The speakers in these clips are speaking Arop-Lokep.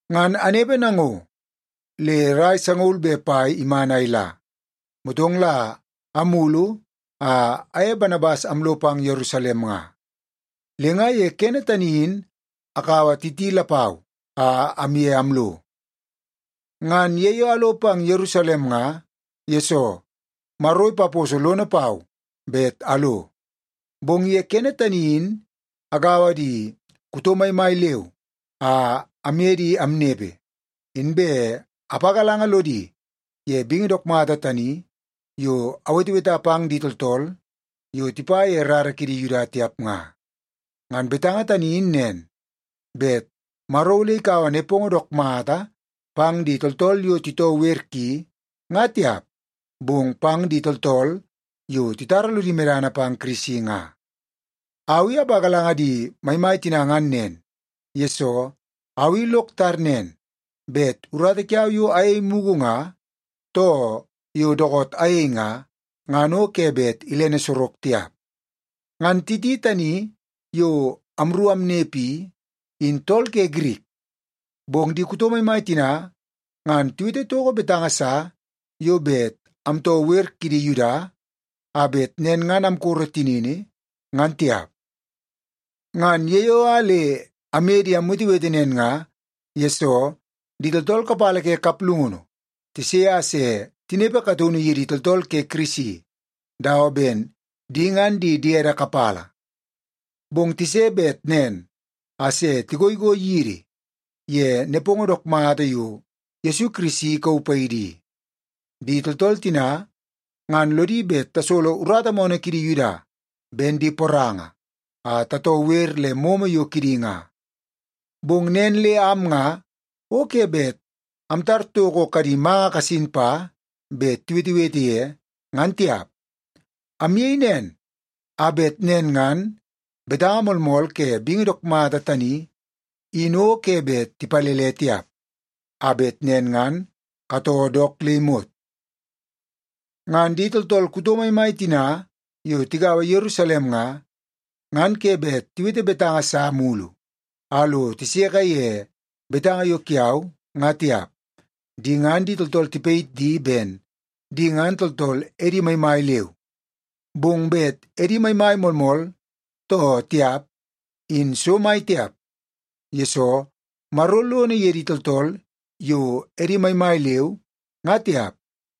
Ngan anepe nango le rai sangaul be pai iman a ila, motong la amulu a aye Banabas amlo pang Yerusalem nga. Le nga ye kene tani in akaua Titi lapau a amye amlo. Ngan ye yo alo pang Yerusalem nga, yesoo Maro ipaposo lono pau bet alo. Bong ye kene tani in agaua di kuto maimai leu a amye di amnepe, inbe apagalanga lodi ye bingi dook mata tani yo aweteweta pang di tooltool yo tipa ye rara kidi Yuda tiap nga. Ngan betanga tani in nen, bet Maro ole ikaua nepongo dook mata pang di tooltool yo titoo wer ki nga tiap, bong pang di tooltool yo titara lodi medana pang Kirisi nga. Au i apagalanga di maimai tina ngan nen, yesoo au i lok tar nen, bet urata kiau yo ayei mugu nga, too yo dookoot ayei nga, ngan o ke bet ilene sorok tiap. Ngan Titi tani yo amru amnepe i, in tool ke Girik. Bong di kuto maimai tina ngan tiwete toko betanga sa yo bet amtoo wer kidi Yuda a bet nen ngan amkoro tinini, ngan tiap. Ngan ye yo a le amye di amwetewete nen nga, yesoo di tooltool kapala ke kaplungunu tise a se tinepe kataunu yidi tooltool ke Kirisi dawa ben di ngan di diede kapala. Bong tise bet nen a se tigoigoi yidi ye nepongo dook mata yo Yesu Kirisi ikauu paidi i. Di tooltool tina ngan lodi bet tasolo urata moonoo kidi Yuda ben di poranga a tatoo wer le momo yo kidi nga. Bong nen le am nga o ke bet amtar toko kadi manga kasin pa bet tiwetewete ye, ngan tiap. Amyei nen a bet nen ngan betanga moolmool ke bingi dook mata tani in o ke bet tipalele tiap, a bet nen ngan katoo dook le imot. Ngan di tooltool kuto maimai tina yo tigaua Yerusalem nga, ngan ke bet tiwete betanga sa mulu a lo tiseke ye betanga yo kiau nga tiap. Di ngan di tooltool tipayit di ben di ngan tooltool edi maimai leu. Bong bet edi maimai moolmool too tiap in so mai tiap, yesoo Maro lono ye di tooltool yo edi maimai leu nga tiap.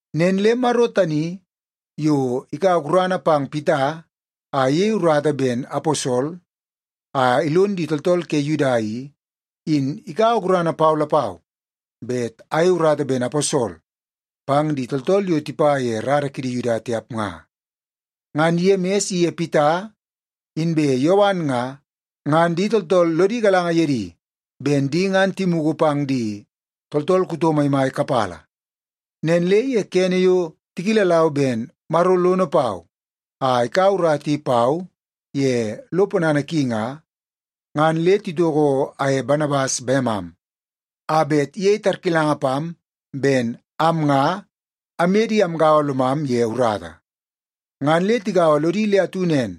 Nen le Maro tani yo ikaua gurana pang Pita a iyei urata ben aposol a ilon di tooltool ke Yuda i, in ikaua gurana pau lapau bet ayei urata ben aposol pang di tooltool yo tipa ye rara kidi Yuda tiap nga. Ngan Yemis iye Pita inbe Yowan nga, ngan di tooltool lodi galanga ye di ben di ngan timugu pang di tooltool kuto maimai kapala. Nen le ye kene yo tikilalau ben Maro lono pau a ikaua urata i pau ye lo ponana ki nga, ngan le titoko aye Banabas bemam a bet iyei tarkilanga pam ben am nga amye di amgaua lomam ye urata. Ngan le tigaua lodi le atu nen,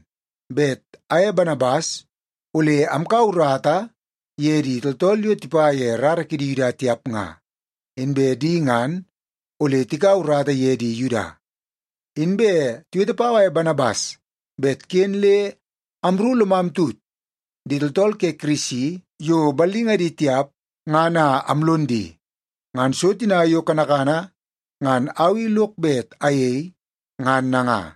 bet aye Banabas ole amkaua urata ye di tooltool yo tipa ye rara kidi Yuda tiap nga, inbe di ngan ole tikaua urata ye di Yuda. Inbe tiwete pau aye Banabas bet ken le amru lomam tut di tooltool ke Kirisi yo ballingadi tiap ngan a amlon di. Ngan so tina yo kanakana ngan au i lok bet ayei ngan nanga.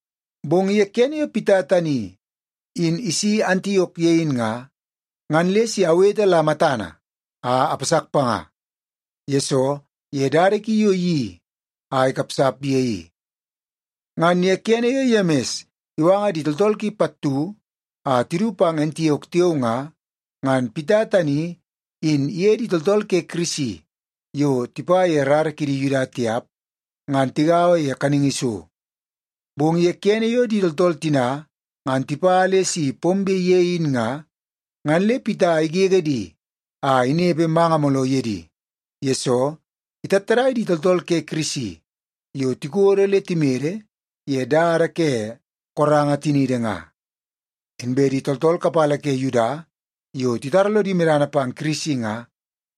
Bong ye kene yo Pita tani in isi Antiok ye in nga, ngan le si awete la matana a apasak panga, yesoo ye dada ki yo iyeii a ikapsap ye i. Ngan ye kene yo Yemis iwanga di tooltool ki pattu a tidu pang Antiok tiao nga, ngan Pita tani in iye di tooltool ke Kirisi yo tipa ye rara kidi Yuda tiap ngan tigaua ye kaningi so. Bong ye kene yo di tooltool tina ngan tipa le si pombe ye in nga, ngan le Pita igege di a inepe manga mooloo ye di, yesoo itattadai di tooltool ke Kirisi yo tikodo le timede ye dada ke koranga tiniidi nga. Inbe di tooltool kapala ke Yuda yo titara lodi medana pang Kirisi nga,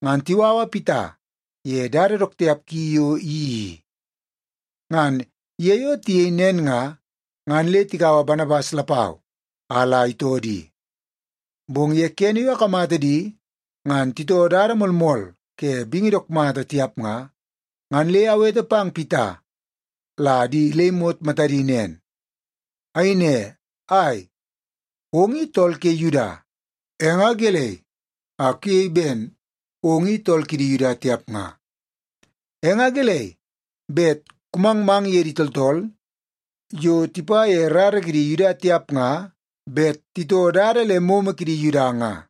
ngan tiwawa Pita ye dada dook tiap ki yo iyeii i. Ngan ye yo tiyei nen nga, ngan le tikaua Banabas lapau a la itoo di. Bong ye kene yo akamata di ngan titoo dada moolmool ke bingi dook mata tiap nga, ngan le awete pang Pita la di le imot matadi nen. Ayei ne, “Ai, ong i tool ke Yuda! E nga gelei a kuyei ben ong i tool kidi Yuda tiap nga? E nga gelei bet kumangmang ye di tooltool yo tipa ye rara kidi Yuda tiap nga bet titoo dada le momo kidi Yuda nga?”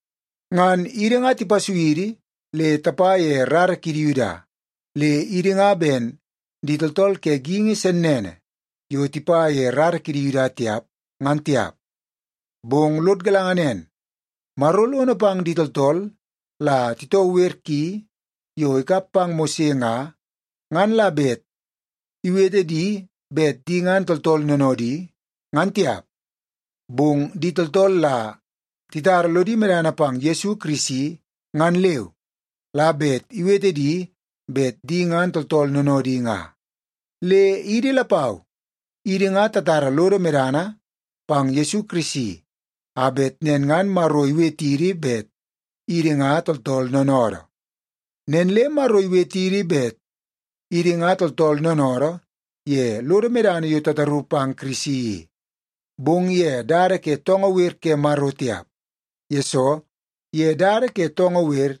Ngan idi nga tipasui idi le tapa ye rara kidi Yuda, le idi nga ben di tooltool ke geingi sennene yo tipa ye rara kidi Yuda tiap, ngan tiap. Bong lod galanga nen, Maro lono pang di tooltool la titoo wer ki yo ikap pang Mose nga, ngan la bet iwete di bet di ngan tooltool noonoodi, ngan tiap. Bong di tooltool la titara lodi medana pang Yesu Kirisi ngan leu la bet iwete di bet di ngan tooltool noonoodi nga. Le idi lapau, idi nga tatara lodo medana pang Yesu Kirisi a bet nen ngan Maro iwetidi bet idi nga tooltool noonoodoo. Nen le Maro iwetidi bet idi nga tooltool noonoodoo ye lodo medana yo tataru pang Kirisi i, bong ye dada ke toongoo wer ke Maro tiap, yesoo ye dada ke toongoo wer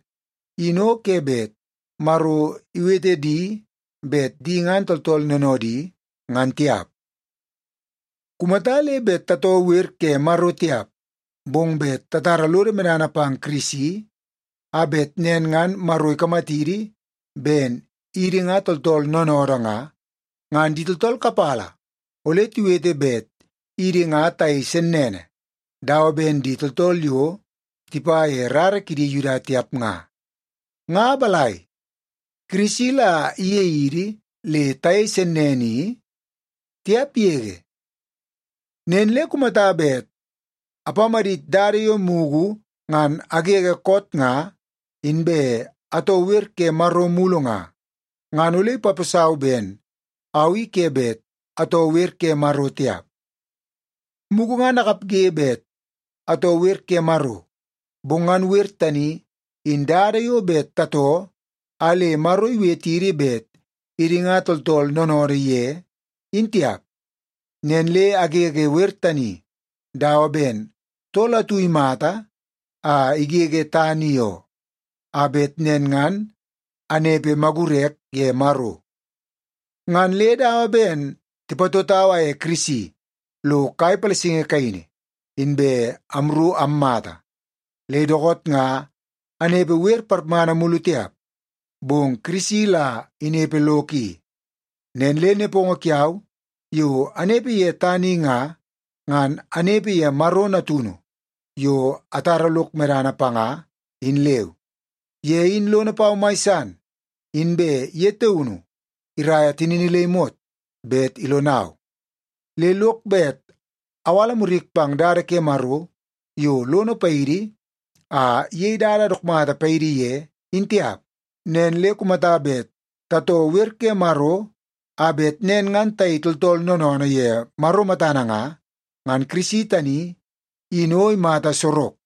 in o ke bet Maro iwete di bet di ngan tooltool noonoodi, ngan tiap. Kumata le bet tatoo wer ke Maro tiap, bong bet tatara lodo medana pang Kirisi a bet nen ngan Maro ikamatidi ben idi nga tooltool noonoodoo nga, ngan di tooltool kapala ole tiwete bet idi nga tayei sennene dawa ben di tooltool yo tipa ye rara kidi Yuda tiap nga. Nga balai, Kirisi la iyei idi le tayei sennene i? Tiap yege! Nen le kumata bet apamadit dada yo mugu ngan agege koot nga inbe atoo wer ke Maro mulu nga, ngan ole ipaposau ben au i ke bet atoo wer ke Maro tiap. Mugu ngan akapge bet atoo wer ke Maro, bong ngan wer tani in dada yo bet tatoo a le Maro iwetidi bet idi nga tooltool noonoodoo ye, in tiap. Nen le agege wer tani dawa ben tool atu imata a igege tana i oo, a bet nen ngan anepe magurek ye Maro. Ngan le dawa ben tipatotau aye Kirisi lo kai palasingi kaini, inbe amru ammata. Le dookoot nga anepe wer parmana mulu tiap, bong Kirisi la inepe lok i. Nen le nepongo kiau yo anepe ye tana i nga, ngan anepe ye Maro Natunu yo atara lok medana panga, in leu. Ye in lono pau mai san, inbe ye taunu iraia tinini le imot bet ilonau. Le lok bet awala murik pang dada ke Maro yo lono paidi a iyei dada dook mata paidi ye, in tiap. Nen le kumata bet tatoo wer ke Maro a bet nen ngan tayei tooltool noonoonoo ye Maro matana nga, ngan Kirisi tani in o imata sorok.